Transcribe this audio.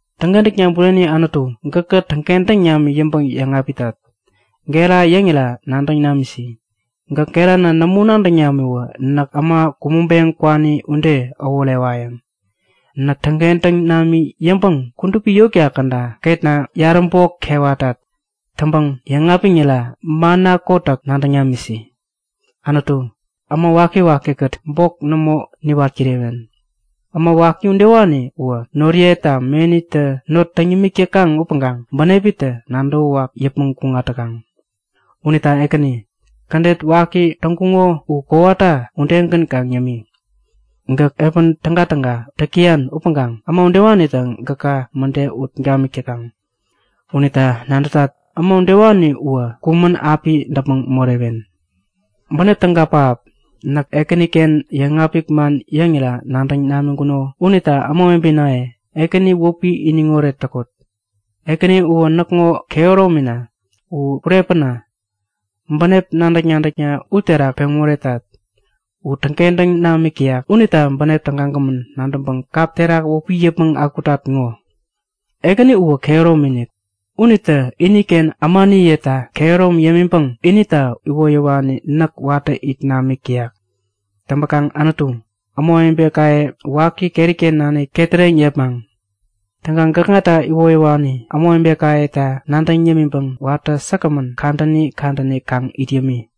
Täŋkentäkna bureni Anutu, gäkä täŋkentäŋ nami yäŋpäŋ yäŋapitat. Gera yäŋira nadäŋ namisi. Gäk gerana nämo nadäŋ namiwä näk äma kumäŋpeŋ kwani ude äworewayäŋ. Näk täŋkentäŋ nami yäŋpäŋ kudupi yotka käda ketna yaräbok kewatat. Täŋpäŋ yäŋapiŋira manna kotäk nadäŋ namisi! Anutu, näk äma waki-waki-kät bok nämo niwat kirewen. Äma waki udewani uwä noriyeta menitä not täŋ yämik täkaŋ upäŋkaŋ bänepitä nadäwäwak yäpmäŋ kuŋat täkaŋ. Unita Ekäni, kädet waki täŋkuŋo u kowata udegän kaŋ yämi. Gäk piä tägatäga täk täyan upäŋkaŋ äma udewanitä gäka mäde ut gamik täkaŋ. Unita nadätat, äma udewani uwä kumän api däpmäŋ morewen! Bänep täga pähap! Näk Ekäniken yäŋapik man yäŋira nadäŋ namiŋkuko unita ämawebenaye, Ekäni wäpi iniŋoret täkot! Ekäni uwä näkŋo kehäromina. U kurepäna. Bänep nadäk-nadäkna u terak peŋ moretat. U täŋkentäŋ namik täyak. Unita bänep tägagämän nadäŋpäŋ kap terak wäpi yäpmäŋ akutat ŋo! Ekäni uwä kehäromi-inik. Unitä iniken ämaniyeta kehäromi yämiŋpäŋ inita iwoyäwani näk watä it namik täyak. Täŋpäkaŋ Anutu, ämawebekaye waki keriken nanik ketäreŋ yepmaŋ. Täŋkaŋ gäkŋata iwoyäwani ämawebekayeta nadäŋ yämiŋpäŋ watä säkgämän kadäni kadäni kaŋ it yämi.